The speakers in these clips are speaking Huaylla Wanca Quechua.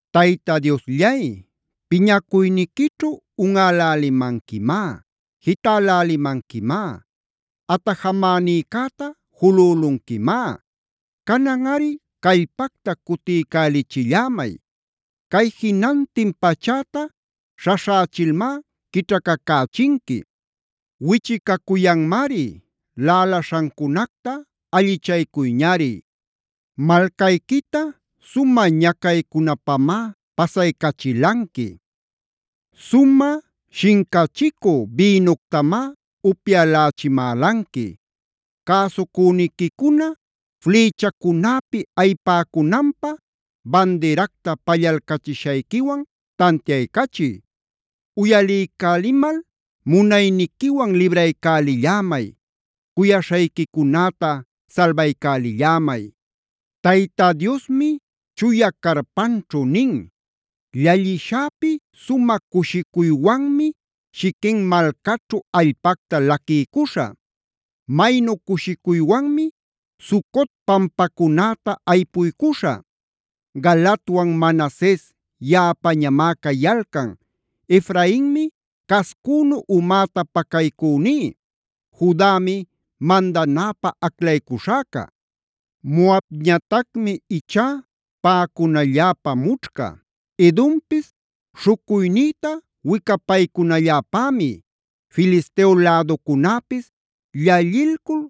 Tayta Diosllay, piñacuyniquićhu unꞌälälimanquimá, jitälälimanquimá, atajamänïcäta julülunquimá. Cananꞌari callpacta cutiycälichillämay. Cay jinantin pachäta śhaśhächilmá quićhacacächinqui. Wichicacuyanmari, laꞌalaśhancunacta allichaycuyñari. Malcayquita sumä ñacaycunapamá pasaycachilanqui. Sumä shincachicü bïnuctamá upyälächimälanqui. Cäsucüniquicuna flïchacunäpi ayipäcunanpä bandiracta pallalcachishayquiwan tantiaycachiy. ¡Uyaliycälimal munayniquiwan libraycälillämay! ¡Cuyaśhayquicunäta salbaycälillämay! Tayta Diosmi chuya carpanćhu nin: “Llallishäpi sumä cushicuywanmi Shiquem malcaćhu allpacta laquiycuśhä. Maynu cushicuywanmi Sucot pampacunäta aypuycuśhä. Galaadwan Manases yaꞌapañamá cayalcan, Efrainmi cascünu umäta pacaycüní, Judami mandanäpä aclaycuśhäca. Moabñatacmi ichá paꞌacunalläpä mućhca. Edompis śhucuynïta wicapaycunalläpämi, Filisteo läducunäpis llallilcul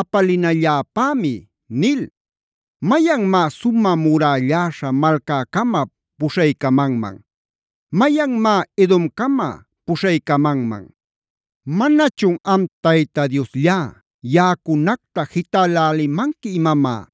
apalinalläpämi” nil. ¿Mayanmá sumä murälläśha malcäcama puśhaycamanman? ¿Mayanmá Edomcama puśhaycamanman? ¿Manachun am Tayta Diosllá yaꞌacunacta jitälälimanqui imamá?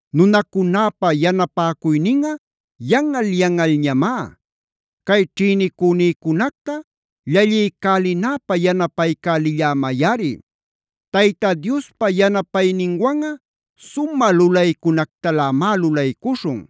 Nunacunäpa yanapäcuyninꞌa yanꞌal-yanꞌalñamá. Cay ćhïnicünïcunacta llalliycälinäpä yanapaycälillämayꞌari. Tayta Diospa yanapayninwanꞌa sumä lulaycunactalämá lulaycuśhun.